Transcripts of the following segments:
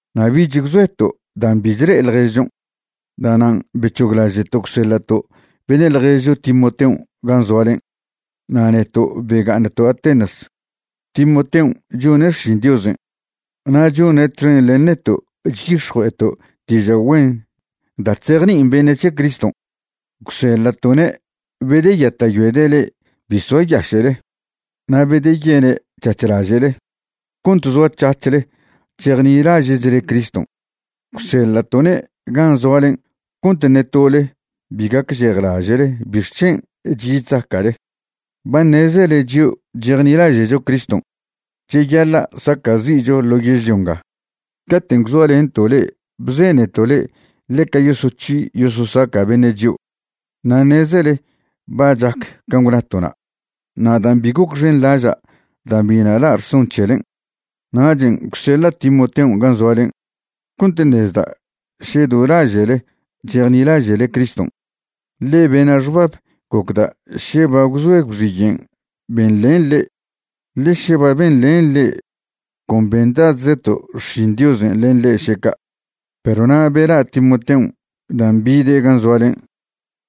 Na' bich gwzoeto' dan' bi chle'e ḻježchon'. Da'nan' bec̱hoglaže'to' gwseḻa'to' beṉe' ḻježcho Timoteon' gan' zoalen' na' neto' bega'aṉto' Atenas. Timoteon' chone' xšin Diosen' na' chone' txen len neto' chyix̱jue'eto' diža' güen da' chzejni'in beṉe' c̱he Criston'. Gwseḻa'to'ne' bedeyata'yoede' le'e bi soayaše'le na' bedeyene' c̱hac̱h laže'le cont zoac̱hac̱hle chejnilaže'chle Criston'. Gwseḻa'to'ne' gan' zoalen' cont ṉe tole bi gacžejlaže'le bixc̱hen' chyi chzaca'le. Ba ṉezele chio' chejnilaže'cho Criston' cheyaḻa' saca'zi'cho ḻo yežlio nga. Caten' gwzoalento' le'e bzeneto' le'e ḻeca yosoc̱hi yososaca' beṉe' chio'. Na' ṉezele ba chac can' gwnato'na'. Na' dan' bi gocxenḻaža' dan' biṉa' la' rson c̱helen', nachen' gwseḻa' Timoteon' gan' zoalen' cont ṉezda' še do laže'le chejnilaže'le Criston'. Ḻe bena' xbab gocda' še ba gwzoe gwxiyen' benḻen le'e. Ḻe še ba benḻen le'e, con bendadzeto' xšin Diosen' len le'e še ca'. Perw na' bela' Timoteon' dan' bide' gan' zoalen'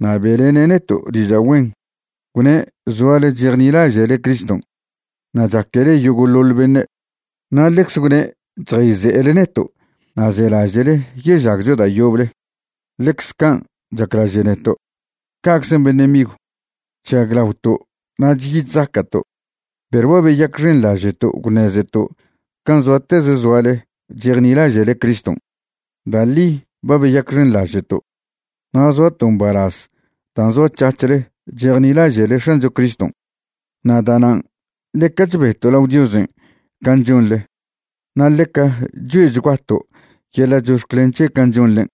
na' be'lene' neto' diža' güen, gwne' zoale chejnilaže'le Criston' na' chaquele yogo'ḻoḻ beṉe'. Na' ḻecze gwne' chjayze'ele neto' na' zelaže'le yežagcho da' yoble ḻecze can' chaclaže' neto'. Ca'czen' beṉe' migw, chžaglaoto' na' chyi chzaca'to', perw ba beyacxenḻaže'to' gwṉezeto' can' zoateze zoale chejnilaže'le Criston'. Da' ḻi ba beyacxenḻaže'to' na' zoato' mbalaz dan' zoac̱hac̱hle chejnilaže'le X̱ancho Criston'. Na' da'nan' ḻeca chbeto' lao Diosen' can' chonḻe na' ḻeca choe'chguato' yeḻa' chox̱clen c̱he' can' chonḻen'.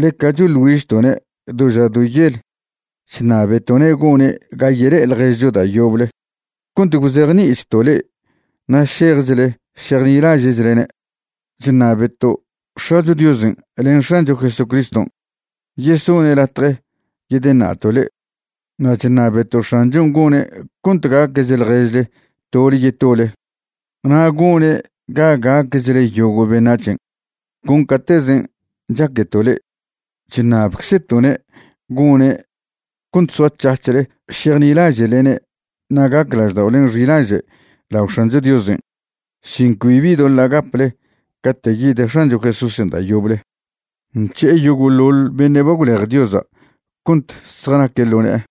Ḻeca choḻ güižto'ne' do ža do yel chṉabeto'ne' gone' ga yele'e ḻježcho da' yoble cont gwzejni'ichto' le'e na' šejchle šejnilaže'chlene'. Chṉabeto' X̱acho Diosen' len X̱ancho Jesucriston' yesone' latje yedeṉa'to' le'e. Na' chṉabeto' X̱anchon' gone' cont gaquech ḻježle tole yetole na' gone' ga gaquechle yogo' beṉac̱hen' con catezen' chaqueto' le'e. Chṉabeczeto'ne' gone' cont soac̱hac̱hle šejnilaže'lene' na' gac lažda'olen' xilaže' lao X̱ancho Diosen' sin cbibi doḻa' gaple cate' yid X̱ancho Jesúsen' da' yoble nc̱he'e yogo'ḻoḻ beṉe' ba gwlej Diosa' cont zjanaque' ḻo ne'e.